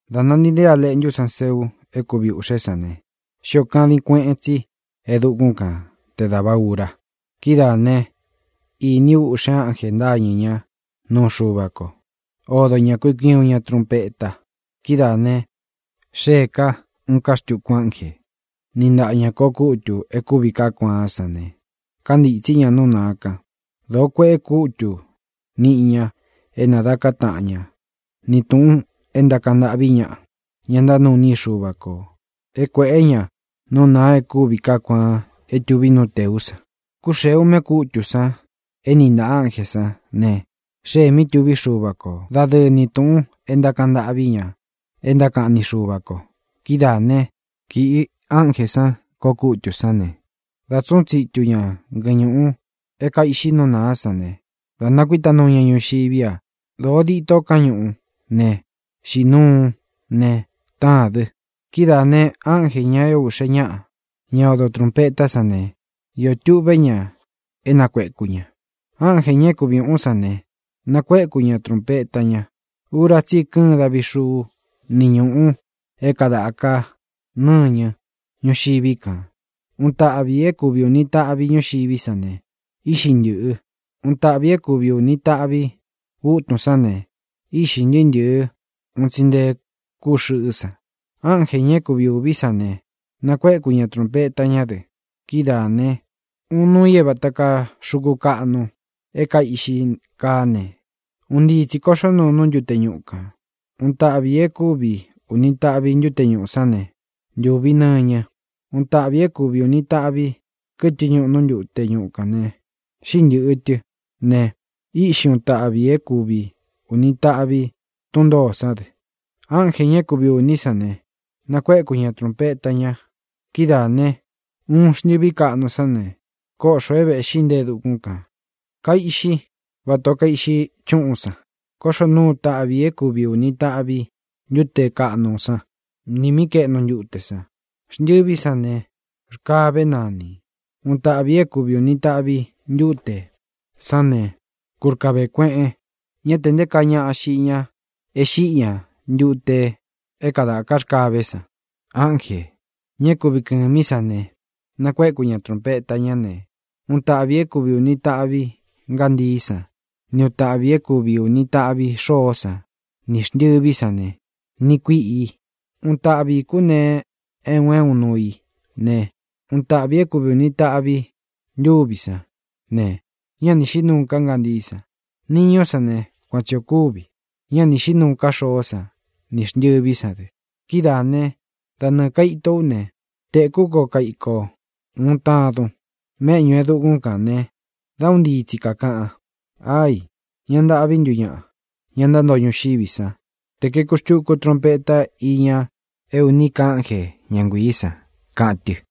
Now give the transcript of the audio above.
Dā nantii nteé A Leꞌntú san seu é kuvi ūꞌxé san ne, xíō kadin kueꞌen tsi e dukún kan te dāva ura. Kidáā ne, iní u uꞌxe ánjē ntáñɨ̄ ñá nuu Xuva ko. Odo ña kui kui uun ña trunpeta. Kidáā ne, xéē ká uun ká xtuku ánjē, níꞌi ntaꞌa ñā koꞌo kútū e kúvi kaá kuaán san ne, kántītsí ña nú nāa kan. Dōo kueꞌe kútu niꞌi ña é nādaká taꞌan ña ni tūꞌun e ntákaꞌan ntâꞌví ñaꞌa, ña ntánuu iní i Xuva kō, é kuēꞌé ña nú nāa e kúvi kaá kuaan é tuví nú tēú san. Kúxēe uꞌme kútū san é niꞌi ntāꞌa ánjē sán ne, xée mí tuví Xuva ko dadɨɨ ni tūꞌun e ntákaꞌan ntâꞌví ña e ntákaꞌan ni Xuva ko. Kidáā né, kīꞌi ánjē san koꞌo kútū sán ne, dā tsúꞌun tsitu ña ngɨñūꞌu é kaiꞌxi nú nāá san ne, da nakuíta nuu ña ñuxiví a. Dōo dito káñuꞌú ne, xīꞌí nuu ne, táān dɨ. Kidáā ne, ánjē, ña é ūꞌxe ñáꞌa, ñá odo trūnpetá san ne, íō tuꞌvé ña é nakuēku ña. Ánjē, ña é kuvi ūun sán ne, nakuéku ña trunpeta ña. Ura tsí i kɨ́ɨn davi xuú ni ñūꞌu é kādaka nɨ́ñɨ ñúxiví kān. Uun taꞌvi ī é kuvi ūni taꞌvi ñúxiví san ne, íꞌxi ntɨ̄ꞌɨ. Uun taꞌvi ī é kuvi ūni taꞌvi utún san ne, íꞌxī ntɨɨ́ ntɨ̄ɨ́ un tsi nté kuꞌu xɨꞌɨ́ san. Ánjē, ña é kuvi ūví san ne, nakuéku ña trūnpeta ñá dɨ. Kidáā ne, uun nuu i é vāta kaa xuku kaꞌnu é kaiꞌxi kaá ne, un ntii tsī koꞌxó nuu nú ntute ñuꞌu kān. Uun taꞌvi ī é kuvi ūni taꞌvi ntute ñúꞌu sán ne, ntūvi nɨñɨ. Uun taꞌvi ī é kuvi ūni taꞌvi kɨtɨ ñúꞌu nú ntute ñuꞌu kān ne, xíꞌi ntɨ̄ꞌɨ tɨ ne, íꞌxi uun tāꞌvi i é kuvi ūni taꞌvi tún ntōó san dɨ. Ánjē, ña é kuvi ūní san ne, nakuéku ña trūnpeta ña. Kidáā ne, uun xntɨví kaꞌnu sán ne, kóꞌxō é vēꞌxí nte e dukún kān. Kaiꞌxí vatā ó kaiꞌxi chúꞌún san. Kóꞌxō nuu uun taꞌvi i é kuvi ūni taꞌvi ntute káꞌnu sán nī mí kaeꞌnu ntute san. Xntɨví san ne, Rkavé nanī. Uun taꞌvi ī é kuvi ūni taꞌvi ntute sán ne, kúrkavē kueꞌen. Ñá te nté kaa ñaꞌa xiꞌi ña e xíꞌi ña ntute é kadāká rkavé san. Ánjē, ña é kuvi kɨ̄mí san ne, nakuéku ña trūnpeta ñá ne, uun taꞌvi ī é kuvi ūni taꞌvi ngántií san ni uun tāꞌvi i é kuvi ūni taꞌvi xoó san nī xntɨví san ne, niꞌi kuíꞌi. Uun taꞌvi ī kúnee é un é un nuu i ne, uun taꞌvi ī é kuvi ūni taꞌvi ntuví san ne, ñá ni xīꞌí nuu ká ngántií san. Niñú san ne, kuan tsi ō kúvi: ñá ni xīꞌí nuu ká xoó san nī xntɨví san dɨ. Kidáā né, da nɨɨ̄ kaito ú ne, tēkú ko kaiko uun tadun méꞌñū e dukún kān ne dá un ntii tsi kākaꞌan: —¡Ai! ¡Ña ntâꞌví ntu ñaꞌa, ña ntántoo ñuxiví san, te kuēku xtuku trunpeta íña é ūní ka ánje, ña nguiī san! —kaꞌan tɨ.